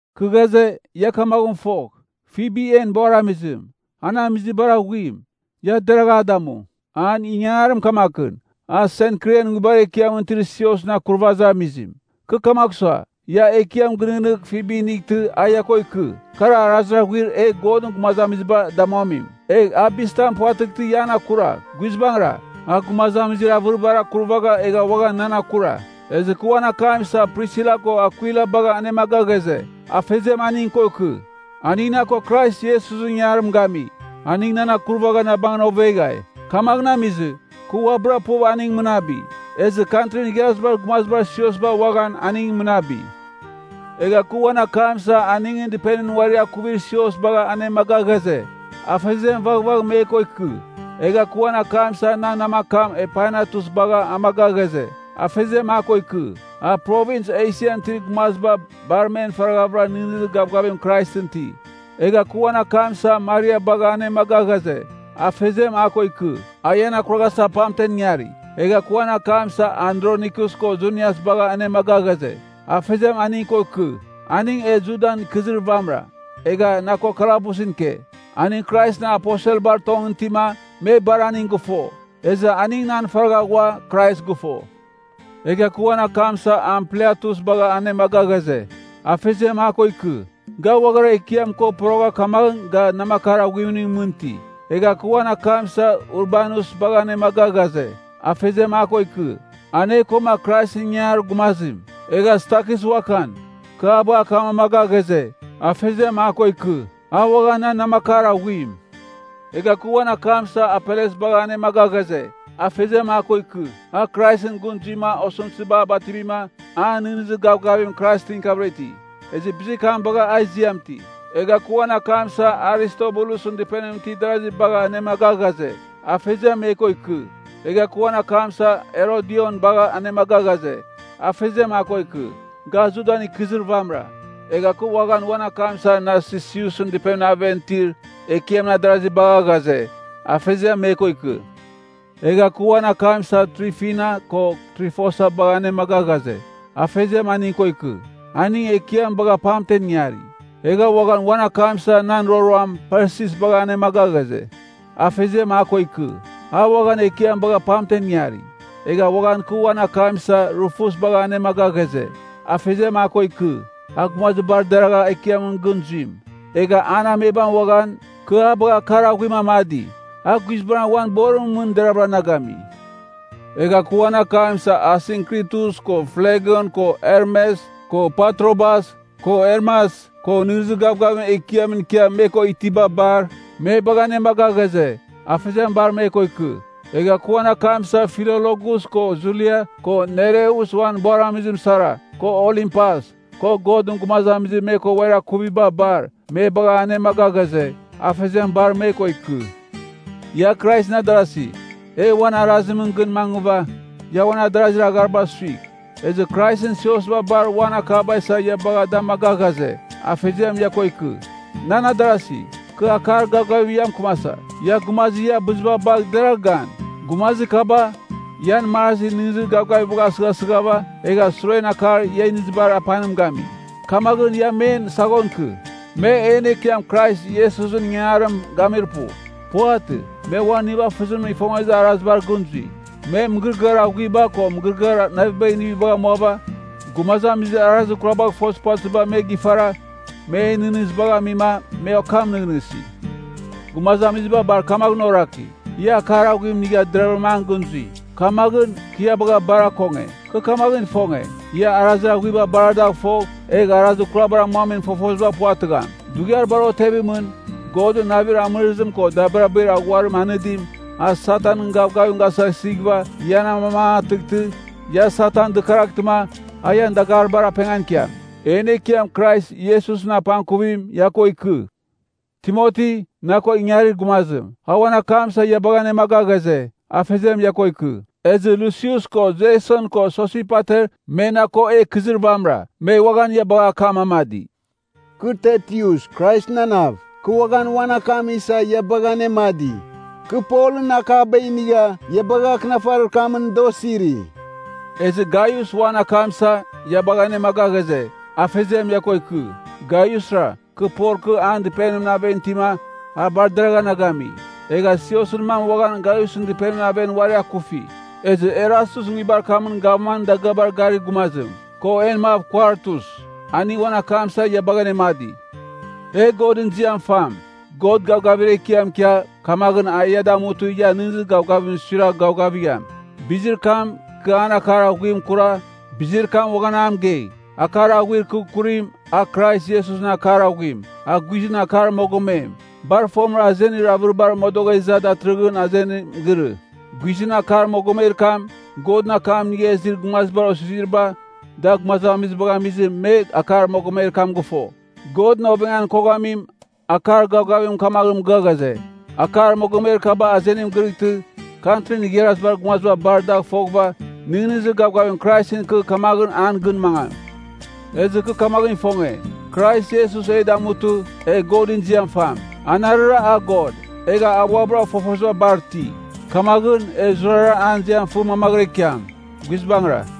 Kɨ ghaze, ia kamaghɨn fogh, Fibi en buaramizim, an amizir bar aghuim. Ia deragh a damu. An ingangarim kamakɨn, a Senkrian nguibar ekiamɨn itir siosɨn akurvazir amizim. Kɨ kamagh sua, ia Ekiam gɨnɨghnɨgh Fibi inightɨ a ia ko ikɨ. Kar arazir aghuir e Godɨn gumazamiziba damuamim. Egh a bizitizim puvatɨghtɨ ia an akuragh. Guizbangɨra, a gumazamizir avɨribar akurvagha egha uaghan nan akura. Ezɨ kɨ uan akam isa Prisila ko Akwila bagha anemaga ghaze, Afeziam aning ko ikɨ. Aning na ko Krais Iesusɨn ingangarim gami. Aning nan akurvagha na bangɨn oveghai. Kamaghɨn amizɨ, kɨ uabɨra puv aning mɨnabi. Ezɨ Kantrin Igharazibar Gumazibar siosba uaghan aning mɨnabi. Egha kɨ uan akam isa aningɨn dɨpenimɨn uari akuvir sios bagha anemaga ghaze, Afeziam vaghvagh me ko ikɨ. Egha kɨ uan akam isa nan namakam Epainetus bagha amaga ghaze, Afeziam a ko ikɨ. A Provins Esian itir gumaziba bar men faraghavɨra nɨghnɨzir gavgavim Kraisɨn iti. Egha kɨ uan akam isa Maria bagha anemaga ghaze, Afeziam a ko ikɨ. A ian akuraghasa pamten ingari. Egha kɨ uan akam isa Andronikus ko Junias bagha anemaga ghaze, Afeziam aning ko ikɨ. Aning e Judan ikɨzir vamɨra, egha na ko kalabusɨn ike. Aning Kraisɨn aposelbar tongɨn itima, me bar aning gɨfo. Ezɨ aning nan faragha ghua Krais gɨfo. Egha kɨ uan akam isa Ampliatus bagha anemaga ghaze, Afeziam a ko ikɨ. Ga uaghara Ekiam ko porogha kamaghɨn ga namakar aghuimningɨn mɨn iti. Egha kɨ uan akam isa Urbanus bagha anemaga ghaze, Afeziam a ko ikɨ. An e koma Kraisɨn ingangarir gumazim. Egha Stakis uaghan, kɨ a bagha akam amaga ghaze, Afeziam a ko ikɨ. A uaghan nan namakar aghuim. Egha kɨ uan akam isa Apeles bagha anemaga ghaze, Afeziam a ko ikɨ. A Kraisɨn gɨn zuima osɨmtɨziba a bativima, an nɨghnɨzir gavgavim Kraisɨn ikiavɨra iti, ezɨ bizir kam bagha a ziam iti. Egha kɨ uan akam isa Aristobulusɨn dɨpenimɨn itir darasi bagha anemaga ghaze, Afeziam me ko ikɨ. Egha kɨ uan akam isa Herodion bagha anemaga ghaze, Afeziam a ko ikɨ. Ga Judan ikɨzir vamɨra. Egha kɨ uaghan uan akam isa Narsisusɨn dɨpenimɨn aven itir Ekiamɨn adarasi bagha ghaze, Afeziam me ko ikɨ. Egha kɨ uan akam isa Trifina ko Trifosa bagha anemaga ghaze, Afeziam aning ko ikɨ. Aning Ekiam bagha pamten ingari. Egha uaghan uan akam isa nan roroam Persis bagha anemaga ghaze, Afeziam a ko ikɨ. A uaghan Ekiam bagha pamten ingari. Egha uaghan kɨ uan akam isa Rufus bagha anemaga ghaze, Afeziam a ko ikɨ. A gumazir bar deragha Ekiamɨn gɨn zuim. Egha an amebam uaghan, kɨ a bagha akar aghuim anemdi. A guizbangɨra uan borimɨn mɨn deravɨra na gami. Egha kɨ uan akam isa Asinkritus ko Flegon ko Hermes, ko Patrobas, ko Hermas, ko nɨghnɨzir gavgavim Ekiamɨn ikia me ko itiba bar, me bagha anemaga ghaze, Afeziam bar me ko ikɨ. Egha kɨ uan akam isa Filologus ko Julia, ko Nereus uan buaramizim sara, ko Olimpas, ko Godɨn gumazamizir me ko uari akuviba bar, me bagha anemaga ghaze, Afeziam bar me ko ikɨ. Ia Kraisɨn adarasi, e uan arazimɨn gɨn mangɨva, ia uan adarazir agharibar suigh. Ezɨ Kraisɨn siosba bar uan akaba isa ia bagha da amaga ghaze, Afeziam ia ko ikɨ. Nan adarasi, kɨ akar gavgavim ia mɨkɨmasa, Ia gumazir ia abɨziba bagh deragh gan. Gumazir kaba, ian marazir nɨghnɨzir gavgavibagh asɨghasɨghava, egha suren akar ia inizibar apanim gami. Kamaghɨn, ia men saghon ikɨ. Me en Ekiam Krais Iesusɨn ingangarim gamir pu. Puvatɨ. Me uan nivafɨzim ifongezir arazibar gɨn zui. Me mɨgɨrɨgɨar aghuiba ko mɨgɨrɨgɨar navibagh inivibagh amuava, gumazamizir arazir kurabagh ifozir puvatɨziba me gifara, men nɨghnɨzibagh amima, me okam nɨghnɨsi. Gumazamiziba bar kamaghɨn oraki, ia akar aghuim inigha deravɨra an gɨn zui. Kamaghɨn, kɨ ia bagha bar akonge. Kɨ kamaghɨn ifonge, ia arazir aghuiba bar adagh fogh, egh arazir kurabar amuamin fofoziba puvatɨgham. Dughiar bar otevimɨn, Godɨn navir amɨrɨzim ko dabirabir aghuarim anɨdim, a Satanɨn gavgavim gasɨghasɨghɨva ian amamangatɨghtɨ, ia Satan dɨkaraghtɨma, a ian dagaribar apengan ikiam. En Ekiam Krais Iesusɨn apangkuvim ia ko ikɨ. Timoti, na ko ingarir gumazim, a uan akam isa ia bagha anemaga ghaze, Afeziam ia ko ikɨ. Ezɨ Lusius ko, Jason ko, Sosipater, me na ko e ikɨzir vamɨra, me uaghan ia bagha akam amadi. Kɨ Tertius Kraisɨn ananav, kɨ uaghan uan akam isa ia bagha anemadi. Kɨ Polɨn akaba inigha ia bagha akɨnafarir kamɨn da osiri. Ezɨ Gaius uan akam isa, ia bagha anemaga ghaze, Afeziam ia ko ikɨ. Gaiusra, kɨ Pol kɨ an dɨpenimɨn aven itima, a bar deragha na gami. Egha Siosɨn mam uaghan Gaiusɨn dɨpenimɨn aven uari akufi. Ezɨ Erastus nguibar kamɨn Gavmanɨn dagɨabar garir gumazim, ko en mav Kuartus, aning uan akam isa ia bagha anemadi. E Godɨn ziam fam! God gavgavir ekiam ikia, kamaghɨn a ia damutɨ ian nɨghnɨzir gavgavimɨn suiragh gavgavigham! Bizir kam, kɨ an akar aghuim akura, bizir kam uaghan a mɨgei. Akar aghuir kɨ akurim, a Krais Iesusɨn akar aghuim, a guizɨn akar mogomem, bar fomɨra azenir avɨribar modogha iza, datɨrɨghɨn azenim girɨ. Guizɨn akar mogomer kam, Godɨn akam inigha izir gumazibar osiziriba, da gumazamizibagh amizɨ, me akar mogomer kam a gɨfo. Godɨn ovengan koghamim, akar gavgavimɨn kamaghɨn mɨgɨa ghaze, akar mogomer kaba azenim girɨtɨ, Kantrin Igharazibar Gumaziba bar dagh foghɨva, nɨghnɨzir gavgavim Kraisɨn ikɨ kamaghɨn an gɨn mangam. Ezɨ kɨ kamaghɨn ifonge, Krais Iesus e damutɨ, e Godɨn ziam fam. Anarɨra a God, egha a uabɨra fofoziba bar iti. Kamaghɨn, e zurara an ziam fɨ mamaghɨra ikiam. Guizbangɨra!